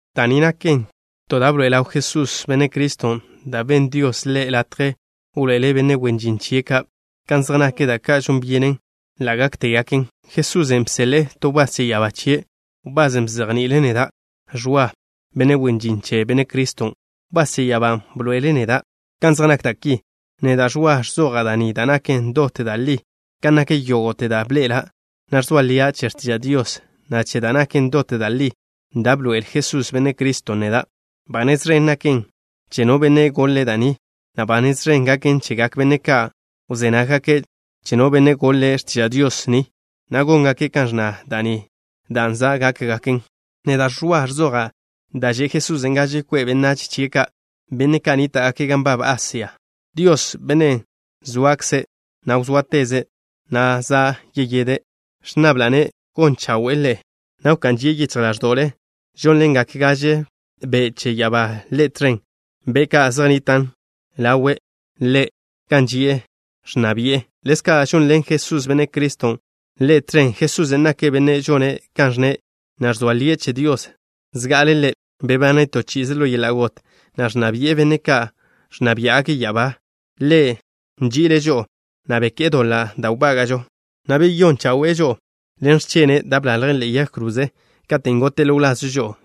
Da' ni naken to da' bḻoe'e ḻaw Jesús, Benne' Criston', da' benn Dios Ḻe' latje wḻoe'ele' benne' wen žin chie' ka' kan zej nak da' ka' žon byenen ḻa' gáktegaken. Jesusen' bseḻe'e to wbás che ya'abá chie', wbasen' bzejni'ile' neda', Ẕwa, benne' wen žin che Benne' Criston'. Wbás che ya'abán' bḻoe'ele' neda' kan zej nak da' ki. Neda', Ẕwa, ẕzoja' da' ni da' naken dot da' li kan nak yógo'te da' bḻe'ela', na' ẕzoa lia' che x̱tiža' Dios, na' che da' naken dot da' li da' bḻoe'el Jesús, Benne' Criston', neda'. Ba nez ẕen gaken che no benne' goḻe' da' ni, na' ba nez ẕen gaken chegak benne' ka' wzé nággake' che no benne' goḻe' x̱tiža' Dios ni, na' góngake' kan ẕnna da' ni, dan' za' gaken. Neda', Ẕwa, ẕzoja' da' že' Jesusen' gaže kwe' benách chie' ka', benne' ka' nníta'gake' gan nbab Asia. Dios, Bennen' zoakze', na' wzóateze', na' za' yide', ẕnnabla'-ne' gon chawe'e ḻe'e, na' wká'n žie' yichj ḻáẕdo'le. Žónḻengak gaže be' che ya'abá Ḻe' tẕen, be' ka' zej nnitan' ḻawe' Ḻe' gan ži'e, ẕnna bi'e. Ḻezka' žonḻen Jesús, Benne' Criston', Ḻe' tẕen. Jesusen' nake' Bennen' žone' kan ẕnne', na' ẕzoa lie' che Dios. Zga'ale' Ḻe' bebane' to chi'ize ḻo yeḻa' got, na' ẕnna bi'e benne' ka' ẕnna biá'gake' ya'abá. Ḻe' nži'ile' žo'o, na' beké'e doḻa' da' wbága'žo, na' beyón chawe'e žo'o ḻen x̱chene' da' bḻalje' ḻe'e yag kroze, katen' gote' ḻo wlazžo žo'o.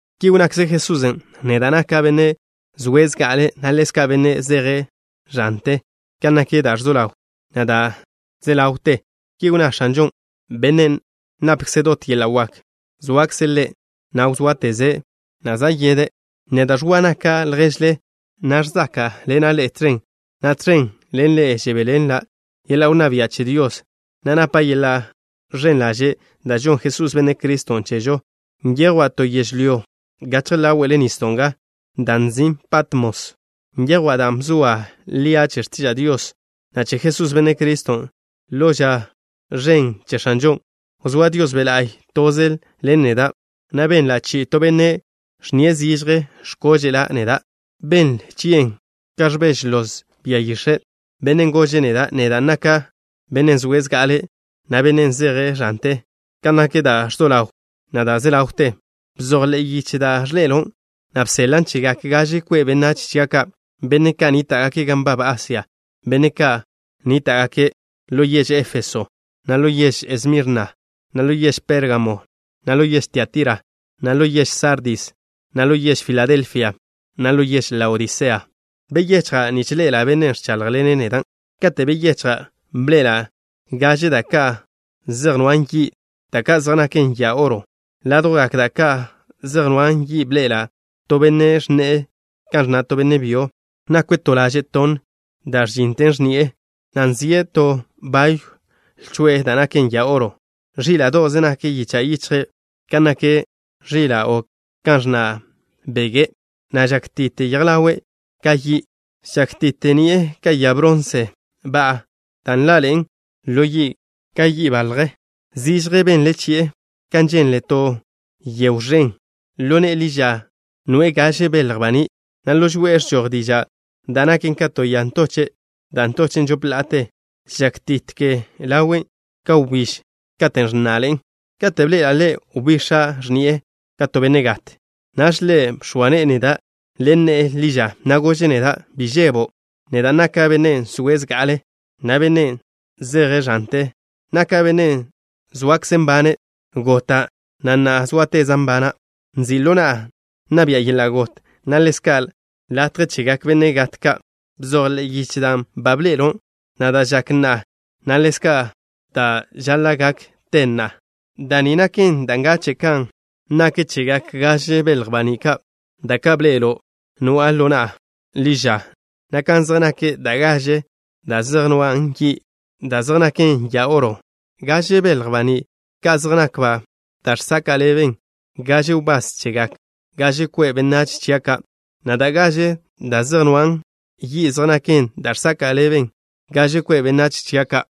Ki wnnakze Jesusen': “Neda' naka' Bennen' zoe' zga'ale', na' ḻezka' Bennen' zeje' ẕante kan nak da' ẕzo ḻaw, na' da' ze ḻawten.” Ki wnná X̱anžon', Bennen' napkze' dot yeḻa' wak. ¡Zoakze' Ḻe', na' wzóateze', na' za' yide'! Neda', Ẕwa, naka' lježle, na' ẕzáka'ḻena' ḻe'e tẕen, na' tẕen ḻen ḻe'e žebéḻenla' yeḻa' wnná bia' che Dios, na' napa' yeḻa' ẕen ḻaže' da' žonn Jesús, Benne' Criston', chežo. Nyejwa' to yežlyó gachje ḻáwe'le nisdo' nga, dan' nzin' Patmos. Nyejwa' dan' bzoa lia' che x̱tiža' Dios, na' che Jesús, Benne' Criston'. Ḻo ža ẕen che X̱anžon', wzóa Dios Be' La'y toze ḻen neda', na' benla' chi'i to benne' ẕnnie' zižje x̱kóže'la' neda'. Benle chi'e kan ẕbeže loz bia yix̱e'. Bennen' gože' neda': “Neda' naka' Bennen' zoe' zga'ale', na' Bennen' zeje' ẕante kan nak da' ẕzo ḻaw, na' da' ze ḻawten. Bzoj ḻe'e yiche da' ẕḻe'elo', na' bseḻan' chegak gaže kwe' benách chia' ka', benne' ka' nníta'gake' gan nbab Asia, benne' ka' nníta'gake': ḻo yež Éfeso, na' ḻo yež Esmirna, na' ḻo yež Pérgamo, na' ḻo yež Tiatira, na' ḻo yež Sardis, na' ḻo yež Filadelfia, na' ḻo yež Laodisea.” Beyechja' nich ḻe'ela' bennen' ẕcháḻjḻene' neda'. Katen' beyechja', bḻe'ela' gaže da' ka' zej nwan' yi', da' ka' zej naken ya oro. Ládjwgak da' ka' zej nwan' yi' bḻe'ela' to Benne' ẕnne'e kan ẕnna' to benne' byo. Nakwe' to laže' tonn da' ẕžinen x̱ni'e, na' nzie' to bayw lcho'e da' naken ya oro. Ẕíla'do'ze nak yicha' yichje' kan nak ẕila' o kan ẕnna' bege', na' žákti'te yej ḻawe' ka yi'. Žákti'te ni'e ka ya bronse ba'a, da' nḻaḻe'en ḻo yi' ka bo' yaḻje. Zižje benle chi'e kan ženle to yegw ẕen. Ḻo ne'e ḻi ža nwe'e gaže belj baní', na' ḻo žoe'e ẕžoj diža' da' naken ka to ya ntoche' da' ntochen' žop la'ate. Žákti'te ḻawe' ka wbíž katen' ẕnná'ḻe'en. Kate' bḻe'ela' Ḻe', wbix̱a' x̱ni'e ka to benne' gat. Naž Ḻe' bx̱oa ne'e neda' ḻen ne'e ḻi ža, na' gože' neda': “Bi žebo'. Neda' naka' Bennen' zoe' zga'ale', na' Bennen' zeje' ẕante. Naka' Bennen' zoakze' nbane'. Gota', na' na'a zóateza' nbana'. Nzi' ḻo na'a nna bi'a yeḻa' got, na' ḻezka' latje chegak benne' gat ka'. Bzoj ḻe'e yiche dan' ba bḻe'elo', na' da' žak na'a, na' ḻezka' da' žaḻa' gak te na'a. Da' ni naken da' ngache' kan nak chegak gaže belj baní' ka', da' ka' bḻe'elo' noa'a ḻo na'a ḻi ža, na' kan zej nak da' gaže da' zej nwan' yi' da' zej naken ya oro. Gaže belj baní' ka' zej nakba' da' žsaka' ḻeben gaže wbás chegak gaže kwe' benách chia' ka', na' da' gaže da' zej nwan' yi' zej naken da' žsaka' ḻeben gaže kwe' benách chia' ka'.”